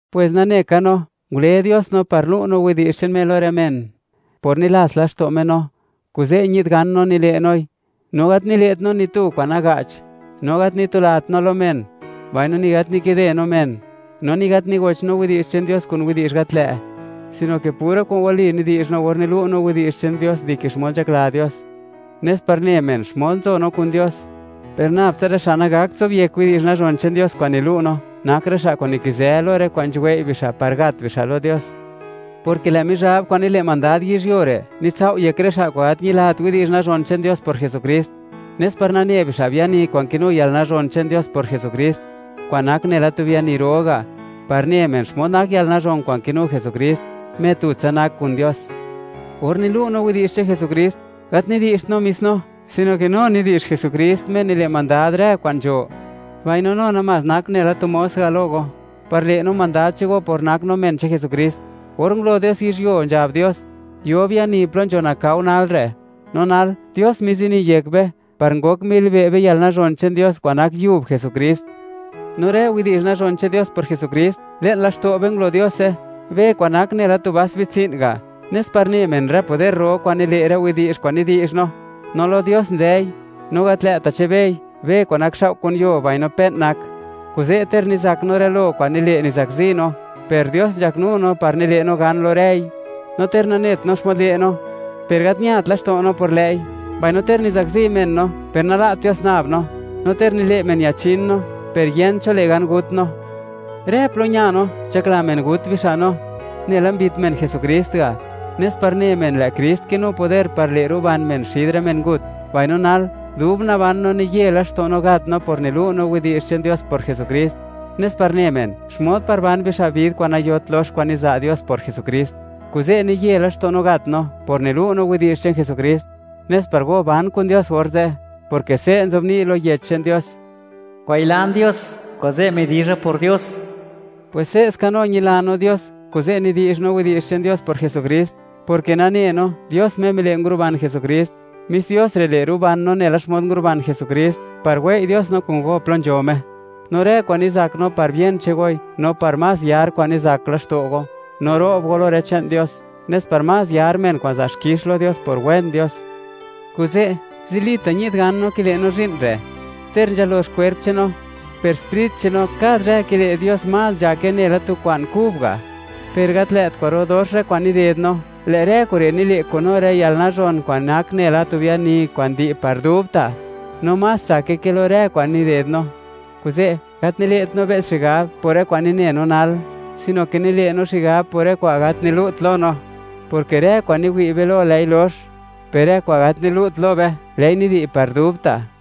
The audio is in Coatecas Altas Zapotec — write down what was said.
Pwes nane ka no, ngule Dios no par lu' no widi'zh che'n Me lo rë men, por nilats laxto' Me no, kuze' ñi'd gan no nile' noi. No gat nile't no ni tu kwa'n naga'ch, no gat nitulat no lo men, mbaino ni gat nikide no men; no ni gat nigoch no widi'zh che'n Dios kun widi'zh gat lë'; sino ke pura kwa'n wali nidi'zh no or nilu' no widi'zh che'n Dios dike xmod nzhakla Dios, nes par ne men, xmod nzo no kun Dios. Per nab tsa rë xa' nagakt zobyek widi'zh nazhon che'n Dios kwa'n nilu' no, nak rë xa' kwa'n nikizë lo rë kwa'n nzhuwei' bixa' par gat bixa' lo Dios, porke lë' Mizhab kwa'n nile' mandad yizhyuo re', nitsao' yek rë xa' kwa'n gat ñilat widi'zh nazhon che'n Dios por Jesukrist, nes par nane bixa' biani kwa'n kinu yalnazhon che'n Dios por Jesukrist, kwa'n nak nela tu biani ro ga' par ne men xmod nak yalnazhon kwa'n kinu Jesukrist, Me tutsa nak kun Dios. Or nilu' no widi'zh che'n Jesukrist, gat nidi'zht no mis no, sino ke no nidi'zh Jesukrist, Me nile' mandad rë kwa'n nzho; mbaino, no namás nak nela tu mos ga' lo go, par le' no mandad che'n go por nak no men che'n Jesukrist. Or ngulo Dios yizhyuo, nzhab Dios: “Yo biani plo nzho nakao nal re'.” No nal, Dios mizini yek be, par ngok milibe' be yalnazhon che'n Dios, kwa'n nak yub Jesukrist. No rë widi'zh nazhon che'n Dios por Jesukrist, le'n laxto' be ngulo Diose, be kwa'n nak nela tu vas bitsi'n ga', nes par ne men rë poder ro kwa'n nile' rë widi'zh kwa'n nidi'zh no, no lo Dios nzëi, no gat lë'ta' che'n bei, be kwa'n nakxao' kun yuo, mbaino pe'n nak be. Kuze', ter nizak no rë lo kwa'n nile', nizakzi no, per Dios nzhaknu no par nile' no gan lo rëi; no ter nanet no xmod le' no, per gat ñat laxto' no por lë'i; mbaino ter nizakzi men no, per nala't Dios nab no; no ter nile' men, ñachin no, per yent cho le' gan gut no. Rë plo ña no, nzhakla men gut bixa' no, nela mbit men Jesukrist ga', nes par ne men, lë' Krist kinu poder par le' ruban men xid rë mengut; mbaino nal, dub naban no, niye laxto' no gat no por nilu' no widi'zh che'n Dios por Jesukrist, nes par ne men, xmod par ban bixa' vid kwa'n nayot lox kwa'n niza' Dios por Jesukrist. Kuze' niye laxto' no gat no, por nilu' no widi'zh che'n Jesukrist, nes par go ban kun Dios orze'. Porke se' nzobni' lo Yech che'n Dios: “Ngwayilan Dios, kuze' midizha por Dios”, pwes se'ska no ñila no Dios, kuze' nidi'zh no widi'zh che'n Dios por Jesukrist, porke nane no, Dios Me mile' nguruban Jesukrist; mis Dios re' le', ruban no nela xmod nguruban Jesukrist, par wei' Dios no kun go plo nzho Me. No rë kwa'n nizak no, par bien che'n goi, no par más yar kwa'n nizak laxto' go, no ro'b go lo rë che'n Dios, nes par más yar men kwa'n za' xkix lo Dios por wen Dios. Kuze', zilita' ñi'd gan kile' no zhi'n re', ter nzhalox kwerp che'n no, per sprit che'n no, kad zhë, kile' Dios más nzhayake, nela tu kwa'n kub ga'. Per gat lë't kwa'ro dox rë kwa'n nided no, lë' rë kure' nile' kun no rë yalnazhon kwa'n nak nela tu biani kwa'n di' par dubta', no más tsake ke lo rë kwa'n nided no. Kuze', gat nile't no be's xigab por rë kwa'n nine no nal, sino ke nile' no xigab por rë kwa'n gat nilu't no lo; porke rë kwa'n niwi' be lo, lë'i lox; per rë kwa'n gat nilu't be lo, lë'i nidi' par dubta'.